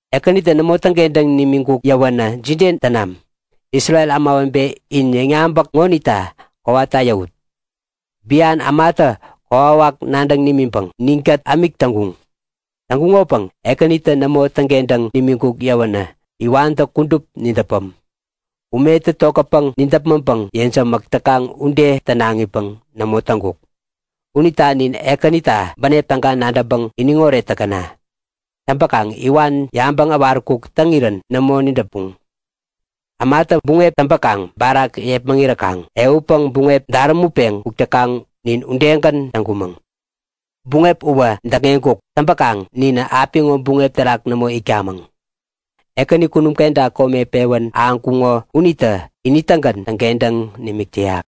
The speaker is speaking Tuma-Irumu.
Ekänitä nämo täŋkentäŋ nimiŋkuk yäwänä jide tänam? Isrel ämawebe, in yäŋyabäk ŋonikta kowata yäwut! Bian ämatä kokwawak nadäŋ nimiŋpäŋ ninkät ämik täŋkuŋ. Täŋkuŋopäŋ Ekänitä nämo täŋkentäŋ nimiŋkuk yäwänä iwantä kudup nidäpäm. Umetä tokätpäŋ nidäpmäŋpäŋ yejämäk täkaŋ ude tänaŋipäŋ nämo täŋkuk! Unita nin Ekänita bänep täga nadäŋpäŋ iniŋoret täkäna! Täŋpäkaŋ iwan yabäŋ äwaräkuk täŋirän nämo nidäpuŋ. Ämatä buŋep täŋpäkaŋ barak yepmäŋiräkaŋ ehutpäŋ buŋep därämutpeŋ kuk täkaŋ nin udegän täŋkumäŋ. Buŋep uwä däkŋeŋkuk. Täŋpäkaŋ ninä apiŋo buŋep terak nämo itkamäŋ. Ekäni, kunum kenta kome pewän ahäŋkuŋo uniktä ini-tägän täŋkentäŋ nimik täyak!